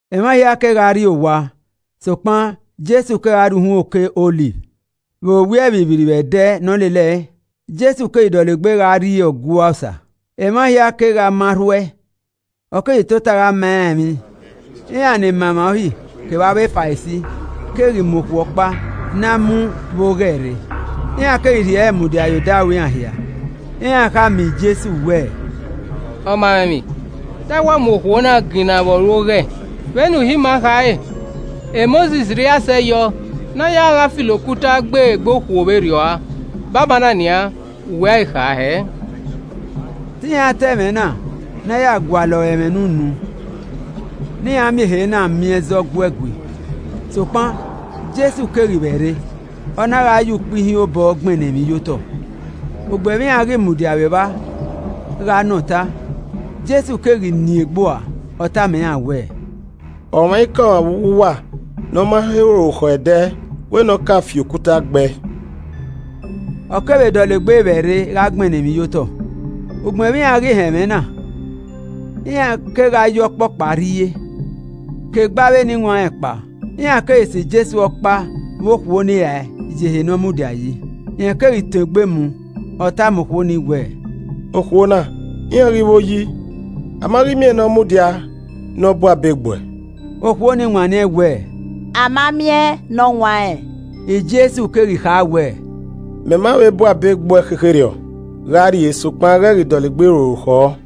[ Emwa hia kegha rri owa sokpan Jesu kegha rrie uhunmwu Oke Ọliv. Vbe owiẹ vbirrivbirri vbe ẹdẹ ne ọ lele ẹe, Jesu keghi dọlegbe gha rrie Ọgua Osa, emwa hia keghi ma rhu ẹe, ọ keghi tota gha ma iran emwi. Iran ni ma emwa Uhi kevbe avbe Farisi keghi mu okhuo ọkpa ne a mu vbe oghẹ rre, iran keghi rhie ẹre mudia ye odaro iran hia. Iran khama Jesu wẹẹ, “Ọmamwaemwi, te a wa mu okhuo na ginnaẹn vbe ọ ru oghẹ. Vbe ne Uhi ima khare, Mosis rhie asẹ yọ ne a ya gha filo okuta gbe egbe okhuo vberriọ rua. Banbanna nian, vbe uwẹ a ghi kha hẹ?” Te iran ta ẹmwẹ na ya gualọ re ẹmwẹ ne unu ne iran miẹn ehe na miẹn ẹzọ gu ẹe gui. Sokpan Jesu keghi vbẹ rre, ọ na gha ye ukpẹ ihiẹn obọ gbẹnnẹ emwi ye otọ. Ugbẹn vbe iran ghi mudia vbe evba gha nọ ọta, Jesu keghi nien egbe ua, ọ tama iran wẹẹ, “Ọmwaikọmwa vbe uwu uwa ne ọ ma he ru orukhọ ẹdẹ, wẹ ne ọ ka fi okuta gbe ẹe.” Ọ kevbe dọlegbe vbẹ rre gha gbẹnnẹ emwi ye otọ. Ugbẹn vbe iran ghi họn ẹmwẹ na, iran kegha ye ọkpọkpa rrie, ke egbe avbe eniwanrẹn kpao. Iran keghi sẹ Jesu ọkpa vbe okhuo ni rae ye ehe ne ọ mudia yi. Rẹn keghi tọn egbe mu, ọ tama okhuo ni wẹ, “Okhuo na iran ghi vbo yi? A ma ghi miẹn ne ọ mudia ne ọ bu abe gbe uẹ?” Okhuo ni wanniẹn wẹẹ, “A ma miẹn nọwanrẹn.” Jesu keghi kha wẹẹ, “Mẹ ma vbe bu abe gbe uẹ khekherriọ. Gha rrie, sokpan, ghẹ ghi dọlegbe ru orukhọ.”]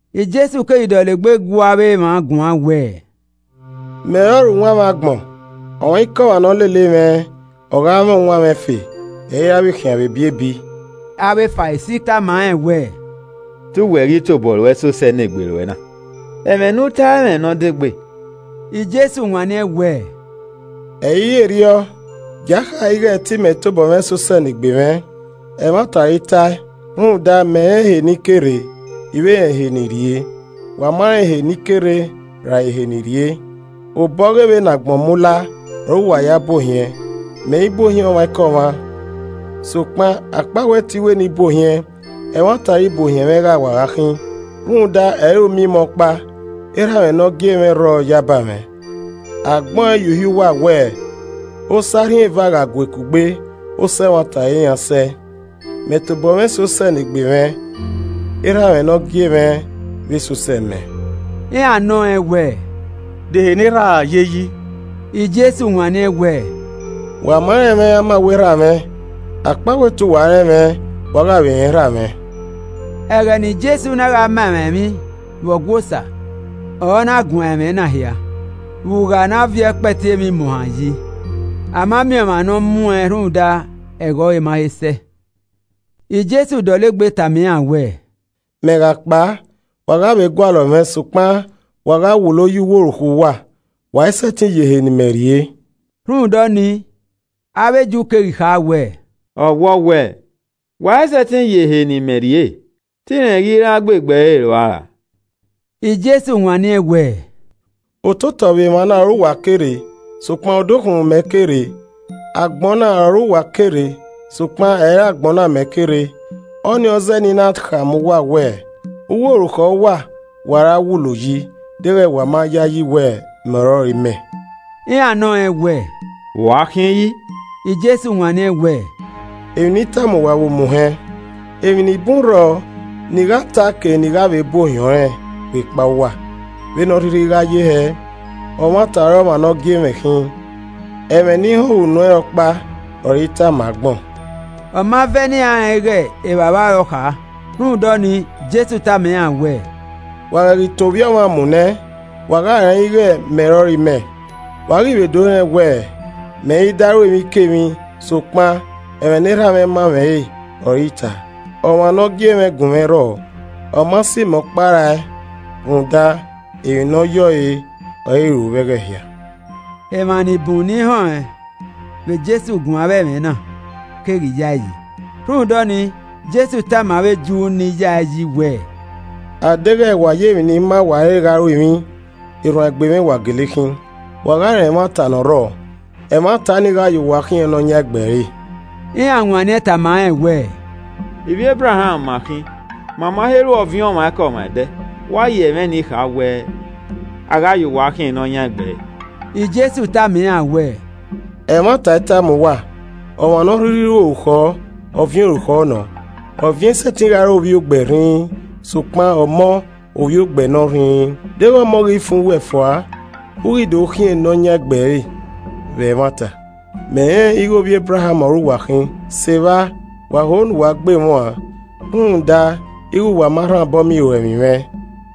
Jesu keghi dọlegbe gu avbe emwa guan wẹẹ, “Mẹ ọrọre uwanmwẹ agbọn, Ọmwaikọmwa ne ọ lele mwẹ, ọ gha mwẹ uwanmwẹ ẹfe, ẹ i ra vbe khian vbe ebiebi.” Avbe Farisi tama rẹn wẹẹ, “Te uwẹ ghi tobọ ruẹ se osẹe ne egbe ruẹ na. Ẹmwẹ ne u tae i mwẹ emwi ne ọ degbe.” Jesu wanniẹn wẹẹ, “Ẹ i re erriọ, gia kha ighẹ te imẹ tobọ mwẹ se osẹe ne egbe mwẹ, ẹmwata ọre I tae rhunmwuda mẹ rẹn ehe ne I ke rre, I vbe rẹn ehe ne I rrie. Wa ma rẹn ehe ne I ke rre ra ehe ne I rrie. Obọ ọghe vbene agbọn mu la ọre uwa ya bu ohiẹn. Mẹ i bu ohiẹn ọmwaikọmwa. Sokpan, akpawẹ te I wẹ ne I bu ohiẹn, ẹmwata ọre ibuohiẹn mwẹ gha wa gha khin, rhunmwuda ẹ i re uma imẹ ọkpa. Erha mwẹ ne ọ gie mwẹ rrọọ yaba mwẹ. Agbẹn ọẹn ye Uhi uwa wẹ osẹe arhin eva gha gue kugbe, osẹe ẹmwata ọre iran sẹe. Mẹ tobọ mwẹ se osẹe ne egbe mwẹ. Erha mwẹ ne ọ gie mwẹ vbe se osẹe mẹ.” Iran nọ rẹn wẹẹ, “De ehe ne erhaa ye yi?” Jesu wanniẹn wẹ, “Wa ma rẹn mwẹ amawẹ Erha mwẹ. Akpawẹ te uwa rẹn mwẹ, wa gha vbe rẹn Erha mwẹ.” Ẹghẹ ne Jesu na gha ma emwa emwi vbe Ọgua Osa ọre ọ na guan ẹmwẹ na hia, vbe ugha ne a viọ ẹkpẹti emwi imuohan yi. A ma miẹn ọmwa ne ọ muẹn rhunmwuda ẹghẹ ọre ma he sẹ. Jesu dọlegbe tama iran wẹẹ, “Mẹ gha kpao, wa gha vbe gualọ mwẹ sokpan wa gha wulo ye uwu orukhọ uwa. Wa i sẹtin yo ehe ne imẹ rrie.” Rhunmwuda ọnii, avbe Ju keghi kha wẹẹ, “Ọwọ wẹ, ‘Wa i sẹtin yo ehe ne ime rrie.’ Te irẹn ghi ra gbe egbe ere ua ra?” Jesu wanniẹn wẹẹ, “Ototọ vbe emwana ọre uwa ke rre, sokpan, odukhunmwu mẹ ke rre. Agbọn na ọre uwa ke rre, sokpan, ẹ i re agbọn na mẹ ke rre. Ọnii ọ zẹẹ ne I na khama uwa wẹ, uwu orukhọ uwa wa ra wulo yi deghẹ wa ma yayi wẹ ‘Mẹ ọrọre imẹ.’” Iran nọ rẹn wẹ, “Vbe u a khin yi?” Jesu wanniẹn wẹẹ, “Emwi ne I tama uwa vbe omuhẹn. Emwi ni bun rrọọ ne I gha ta ke ne I gha vbe bu ohiẹn ọnrẹn vbe ekpa uwa. Vbene ọ rhirhi a gha ye hẹ, ọmwata ọre ọmwa ne ọ gie mwẹ khin, ẹmwẹ ne I họẹn vbe unu ẹnrẹn ọkpa ọre I tama agbọn.” Ọma vẹ ne iran rẹn ighẹ Evbavba ọre ọ kha. Rhunmwuda ọnii Jesu tama iran wẹẹ, “Wa ghẹ ghi tọn Ovbi Ọmwa mu nẹ, wa gha rẹn ighẹ ‘Mẹ ọrọre imẹ.’ Wa ghi vbe do rẹn wẹ, mẹ i da ru emwikemwi sokpan ẹmwẹ ne Erha ma mwẹ re ọre I ta. Ọmwa ne ọ gie mwẹ gun mwẹ rrọọ, ọ ma sẹ imẹ ọkpa rae rhunmwuda emwi ne ọ yẹ ọre, ọre I ru vbe ẹghẹ hia.” Emwa ni bun ni họẹn vbe Jesu guan avbe ẹmwẹ na keghi ya ẹe yi. Rhunmwuda ọnii, Jesu tama avbe Ju ni ya ẹe yi wẹ, “Adeghẹ wa ya emwi ne I ma uwa re gha ru emwi, erhuanegbe mwẹ wa gele khin. Wa gha rẹn ẹmwata ne ọ rrọọ, ẹmwata ni gha ya uwa khian enoyan egbe ẹre.” Iran wanniẹn tama rẹn wẹẹ, “Ivbi Ebraham ma khin ma ma he ru ọviẹn ọmwaikọmwa ẹdẹ. Vbe u a ya ẹmwẹ ni kha wẹ, ‘A gha ya uwa khian enọyan egbe ẹre’?” Jesu tama iran wẹẹ, “Ẹmwata I tama uwa, ọmwa ne ọ rhirhi ru orukhọ, ọviẹn orukhọ nọ. Ọviẹn i sẹtin gha re ovbi e ogbẹ rhinrin, sokpan enọ, ovbi ogbẹ nọ rhinrin. Deghẹ Ọmọ ghi fan uwẹ fua, u ghi do khian enọ yan egbe ẹre vbe ẹmwata. Mẹ rẹnrẹn ighe ivbi Ebraham ọre uwa khin, se evba wa ho ne uwa ghe mwẹ uan rhunmwuda ighe wa ma rhan obọ miẹn iruẹmwi mwẹ.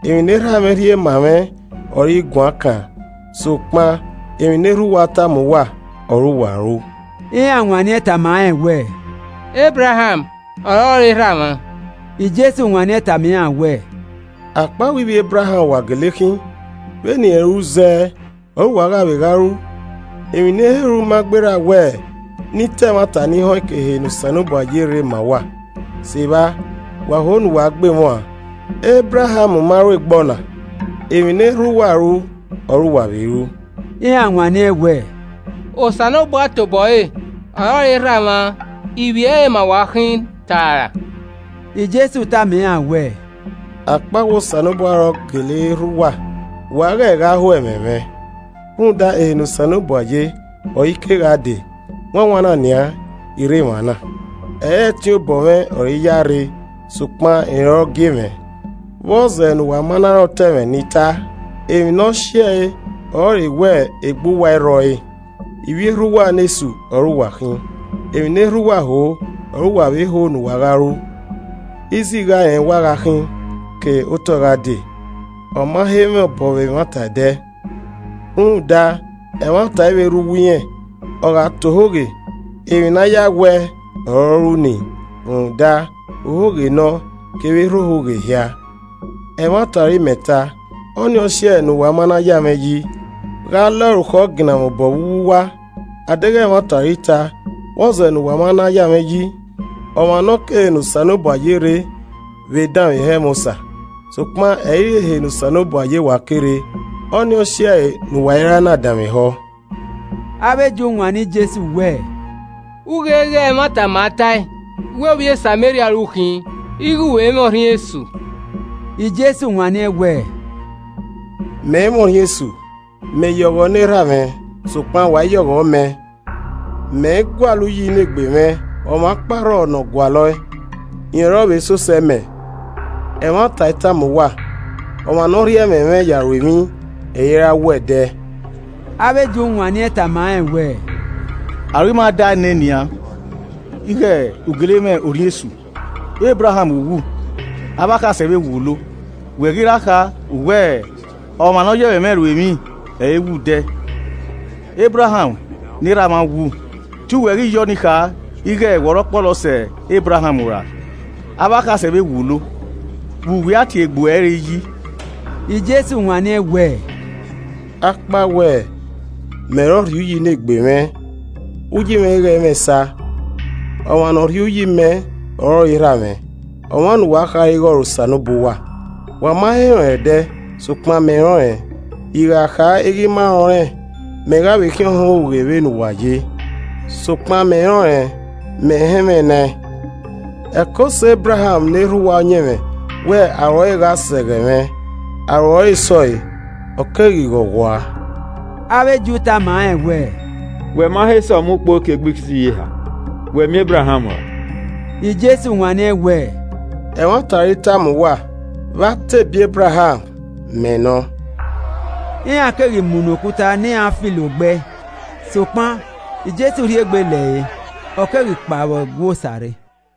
Emwi ne Erha mwẹ rhie ma mwẹ ọre I guan kan, sokpan emwi ne erha uwa tama uwa ọre uwa ru.” Iran wanniẹn tama rẹn wẹ, “Ebraham ọrọre erha mwa.” Jesu wanniẹn tama iran wẹẹ, “Akpawẹ ivbi Ebraham wa gele khin, vbene irẹn ru zẹ ọre uwa gha vbe gha ru. Emwi ne I he ru ma gberra wẹ ne I ta ẹmwata nii họẹn ke ehe ne Osanobua ye rre ma uwa. Se evba wa ho ne uwa gbe mwẹ uan. Ebraham ma ru egbe ọna. Emwi ne erha uwa ru ọre uwa vbe ru.” Iran wanniẹn wẹ, “Osanobua tobọ ẹre ọrọre erha mwa. Ivbi ẹre ma wa khin taa ra.” Jesu tama iran wẹẹ, “Akpawẹ Osanobua ọre ọ gele re erha uwa, wa ghẹ gha ho ẹmwẹ mwẹ, rhunmwuda ehe ne Osanobua ye ọre I ke gha dee, wanwan na nian, I rre emwa na. Ẹ i re ẹtin obọ mwẹ ọre I ya rre, sokpan rẹn ọre ọ gie mwẹ. Vbọzẹ ne uwa ma na rẹn otọ ẹmwẹ ne I ta? Emwi ne ọ si ẹe ọrọre wẹ egbe uwa i rrọ ẹre. Ivbi erha uwa ne Esu ọre uwa khin. Emwi ne erha uwa ho ọre uwa vbe ho ne uwa gha ru. Izigha rẹn wa khin ke otọe gha dee. Ọma he mwẹ obọ vbe ẹmwata ẹdẹ, rhunmwuda ẹmwata i vbe rre uwu irẹn, ọ gha ta ohoghe, emwi ne a ya we ẹe ọre ọ ru ni, rhunmwuda, ohoghe nọ, kevbe erha ohoghe hia. Ẹmwata ọre imẹ ta, ọ ni ọ si ẹe ne uwa ma na ya mwẹ yi. Gha ọ lẹ orukhọ ginna mwẹ obọ vbe uwu uwa? Adeghẹ ẹmwata ọre I ta, vbọzẹ ne uwa ma na ya mwẹ yi? Ọmwa ne ọ ke ehe ne Osanobua ye rre vbe danmwehọ ẹmwẹ Osa, sokpan ẹ i re ehe ne Osanobua ye wa ke rre. Ọnii ọ si ẹe ne uwa i ra na danmwehọ.” Avbe Ju wanniẹn Jesu wẹẹ, “U ghe ighe ẹmwata ma tae wẹ ovbi e Sameria ọre u khin ighe u vbe mwẹ orhiọn esu.” Jesu wanniẹn wẹẹ, “Mẹ i mwẹ orhiọn esu. Mẹ ya ọghọ ne Erha mwẹ sokpan wa i ya ọghọ mẹ. Mẹ i gualọ uyi ne egbe mwẹ, ọmwa ọkpa rrọọ ne ọ gualọ ẹe, rẹn ọre ọ vbe se osẹe mẹ. Ẹmwata I tama uwa, ọmwa ne ọ rhie ẹmwẹ mwẹ ya ru emwi, ẹ i ra wu ẹdẹ.” Avbe Ju wanniẹn tama rẹn wẹ, “Aro ima dae nian ighe u gele mwẹ orhiọn esu. Ebraham wu, avbe akhasẹ vbe wulo, wẹ ghi ra kha, u wẹẹ, ‘Ọmwa ne ọ ya ẹmwẹ mwẹ ru emwi, ẹ i wu ẹdẹ.’ Ebraham ne erha mwa wu. Te u wẹ ghi ya ọnii kha ighe wẹ ọre ọ kpọlọ sẹ Ebraham ra? Avbe akhasẹ vbe wulo, vbe uwẹ a tie egbe ruẹ re yi?” Jesu wanniẹn wẹẹ, “Akpawẹ mẹ ọre ọ rhie uyi ne egbe mwẹ, uyi mwẹ i ghẹ mwẹ esa. Ọmwa ne ọ rhie uyi mẹ ọrọre Erha mwẹ, ọmwa ne uwa khare ighe ọre Osanobua uwa. Wa ma he rẹn ọnrẹn ẹdẹ, sokpan mẹ rẹn ọnrẹn. I gha kha ighe I ma rẹn ọnrẹn, mẹ gha vbe khian ọhọn ohoghe vbe ne uwa ye. Sokpan mẹ rẹn ọnrẹn, mẹ họn ẹmwẹ nẹẹn. Ẹko sẹ Ebraham ne erha uwa ọyẹnmwẹ wẹ aro ẹre gha sẹ ẹghẹ mwẹ, aro ẹre sẹ ọe, ọ keghi ghọghua.” Avbe Ju tama rẹn wẹẹ, “Wẹ ma he sẹ ọmọ ukpo ekigbesiyeha, wẹ miẹn Ebraham ra?” Jesu wanniẹn wẹẹ, “Ẹmwata ọre I tama uwa. Vbe a te bie Ebraham, ‘Mẹ Nọ.’” Iran keghi mu nọ okuta ne iran filo gbe ẹe, sokpan Jesu rhie egbe lẹre, ọ keghi kpao vbe Ọgua Osa rre.